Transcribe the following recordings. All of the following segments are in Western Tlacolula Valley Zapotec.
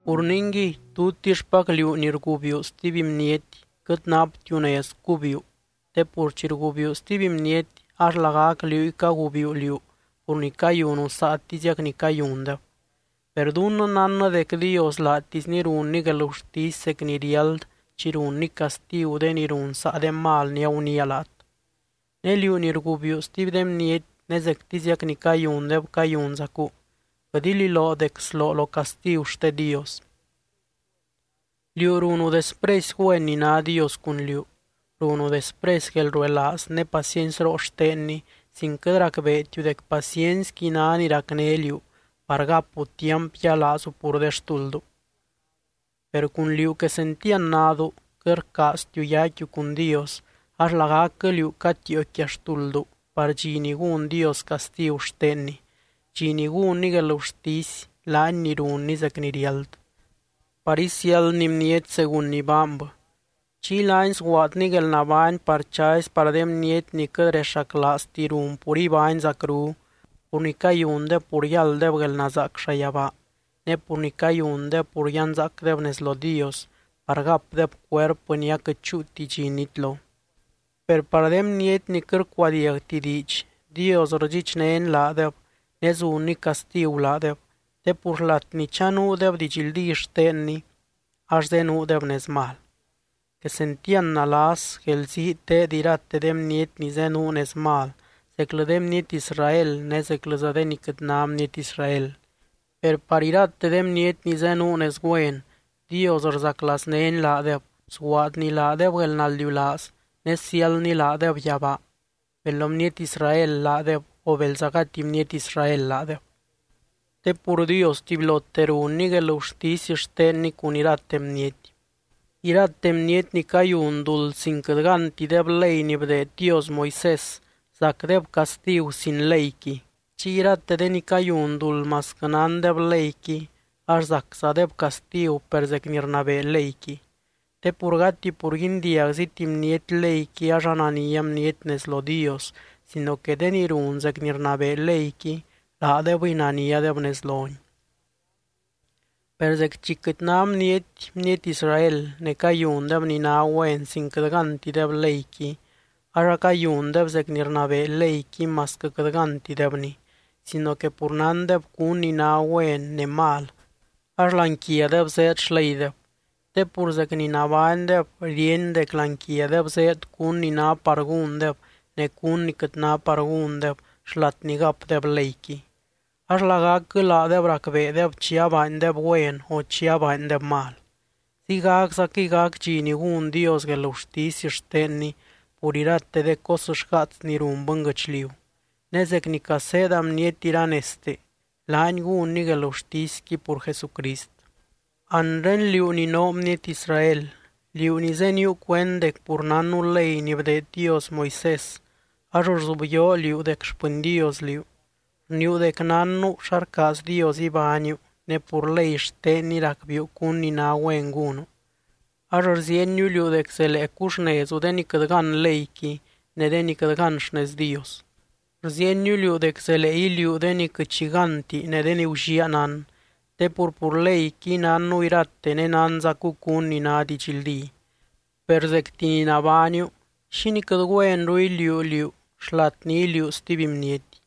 Pur ningui, tutixpacliú ni rgubiuu stuby bniety, quɨt naptiu nez cubiuu te pur chi rgubiuu stuby bniety, ax lagac liúy cagubiuu liú pur ni cayunu saatiziac ni cayundeb. Per dunnɨ nánnɨ dec Dios laatisny runny guelgurtisy zec ni riáld chi runny castigu de ni run saa de mal ni aguniia laat. Ne liú ni rgubiuu stuby de bniety ne zectiziac ni cayundeb cayunzacu, quɨt ililoo dec sloo lo castigu xte Dios. Liú runu despresy güen ni ná Dios cun liú, runu despresy guelruelaaz ne paciencyroo xtenny sin quɨt racbeetiu dec paciencyqui ná ni racné liú par gapu tiamp yialaazu pur de xtulddu. Per cun liú quesentiand nadu, quɨt rcaaztiu yaicquiu cun Dios ax lagacquɨ liú catiio quia xtulddu par dxi ni gún Dios castigu xtenny, dxi ni gúnny guelgurtisy, laany ni runny zec ni riáld par isiáldny bniety según ni baanbɨ. Chiy laany sguaadny guelnabány par chazy par de bniety ni quɨt rexaclaazti run pur ibány zacru, pur ni cayundeb pur yálddeb guelnazaac llayabaa, ne pur ni cayundeb pur yanzaacdeb nez lo Dios par gapdeb cuerpɨ ni aquɨt chúuti dxi nitlo. Per par de bniety ni quɨt rcuadiagti diidx, Dios rdxichnény laadeb ne zunny castigu laadeb, te pur xlat ni chanuudeb didxldí xtenny ax zenuudeb nez mal. Quesentiand nalas, guelzii teed irate de bniety ni zenuu nez mal, zeclɨ de bniety Israel ne zeclɨza de ni quɨt ná bniety Israel. Per par irate de bniety ni zenuu nez güen, Dios rzaclaaznény laadeb, sguaadny laadeb guelnaldiulaaz ne siáldny laadeb yabaa, bel bniety Israel laadeb o belza gati bniety Israel laadeb. Te pur Dios tubylote runny guelgurtisy xtenny cun irate bniety. Irate bniety ni cayun duld sin quɨt gántideb ley ni bdeed Dios Moisés, zacdeb castigu sin leyqui. Chiy irate de ni cayun duld masquɨ nándeb leyqui, ax zaczadeb castigu per zec ni rnabee leyqui. Te pur gati pur guindiagziti bniety leyqui ax anania bniety nez lo Dios, sino que de ni run zec ni rnabee leyqui, laadebɨy naniadeb nez lony. Per zec chi quɨt ná bniety, bniety Israel, ne cayundeb ni ná güen sin quɨt gántideb leyqui, ax acayundeb zec ni rnabee leyqui masquɨ quɨt gántidebni, sino que pur nándeb cún ni ná güen ne mal ax láani quiadeb zéed xleydeb. Te pur zec ni nabánydeb, ríeny dec láani quiadeb zéed cún ni ná par gúndeb ne cún ni quɨt ná par gúndeb xlat ni gapdeb leyqui. Ax lagacquɨ laadeb racbeedeb chi abaandeb güen o chi abaandeb mal. Ziygaczaquɨy gac dxi ni gún Dios guelgurtisy xtenny pur irate de cos xgaats ni run bɨnguɨchliu. Ne zec ni caseeda bniety iranezte, laany gúnny guelgurtisqui pur Jesucrist. Anre, liú ni noo bniety Israel, liú ni zéniuu cuend dec pur nánnu ley ni bdeed Dios Moisés ax rzubyoo liú dec xpɨny Dios liú. Rniiu dec nánnu xa rcaaz Dios ibániu ne pur ley xtenny racbiiu cún ni ná güen gúnu. Ax rziieniu liú dec zelee cuxnezu de ni quɨt gán leyqui ne de ni quɨt gán xnez Dios. Rziieniu liú dec zelee iliuu de ni quɨt xi gánti ne de ni gulliaa nán, te pur, pur leyqui, nánnu irate ne nánzacu cún ni ná didxldí. Per zecti ni nabániu, ¿xínii quɨt güenru iliuu liú xlat ni iliuu stuby bniety?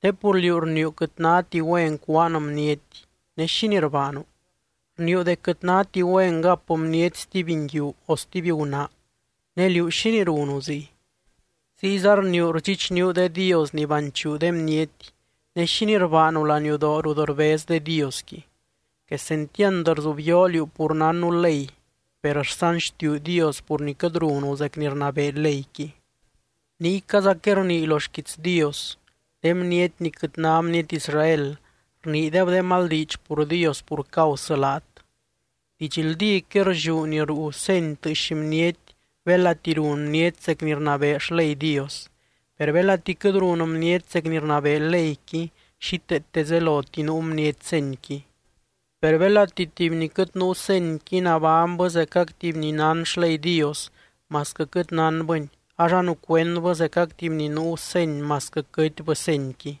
Te pur liú rniiu quɨt náti güen cúaan bniety ne, ¿xínii rbaanu? Rniiu dec quɨt náti güen gap bniety stuby nguiu o stuby gunaa ne liú, ¿xínii runu ziy? Ziyza rniiu rdxichníu de dios ni banchuu de bniety ne, ¿xínii rbaanu laniudoo rut rbez de diosqui? Quesentiand rzubyoo liú pur nánnu ley per rsanxtiuu Dios pur ni quɨt runu zec ni rnabee leyqui. Niycazaquɨy rnii lo xquiits Dios: “De bniety ni quɨt ná bniety Israel, rniideb de mal diidx pur Dios pur causɨ laat.” Didxldíquɨy rlliú ni ruu seny tɨɨx bniety belati run bniety zec ni rnabee xley Dios. Per belati quɨt run bniety zec ni rnabee leyqui, xíteete zeloti nuu bniety senyqui. Per belati tuby ni quɨt nuu senyqui nabánybɨ zecac tuby ni nán xley Dios, masquɨ quɨt nánbɨni, ax anucuendbɨ zecac tuby ni nuu seny masquɨ quɨtbɨ senyqui.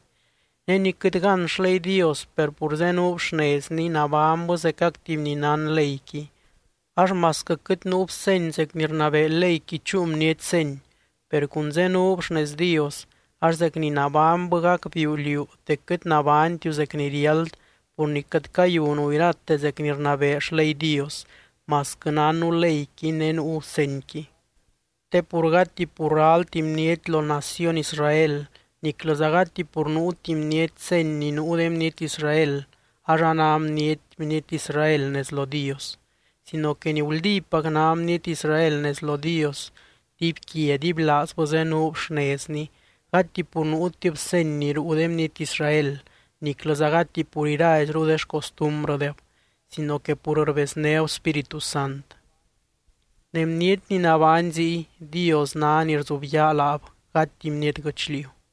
Ne ni quɨt gán xley Dios per pur zenuub xnezny nabánybɨ zecac tuby ni nán leyqui, ax masquɨ quɨt nuub seny zec ni rnabee leyqui chúu bniety seny, per cun zenuub xnez Dios, ax zec ni nabánybɨ gacbiiu liú dec quɨt nabánytiu zec ni riáld pur ni quɨt cayunu irate zec ni rnabee xley Dios, masquɨ nánnu leyqui ne nuu senyqui. Te pur gati pur ralti bniety lo naciony Israel niclɨza gati pur nuuti bniety seny ni nuu de bniety Israel ax a ná bniety, bniety Israel nez lo Dios. Sino que ni guldípac ná bniety Israel nez lo Dios, dibyquia dibylaazbɨ zenuub xnezny gati pur nuutib seny ni ruu de bniety Israel niclɨza gati pur iraizru de xcostumbrɨdeb, sino que pur rbeznéb Spíritu Sant. Ne bniety ni nabány ziy, Dios ná ni rzubyaa laab gati bniety guɨchliu.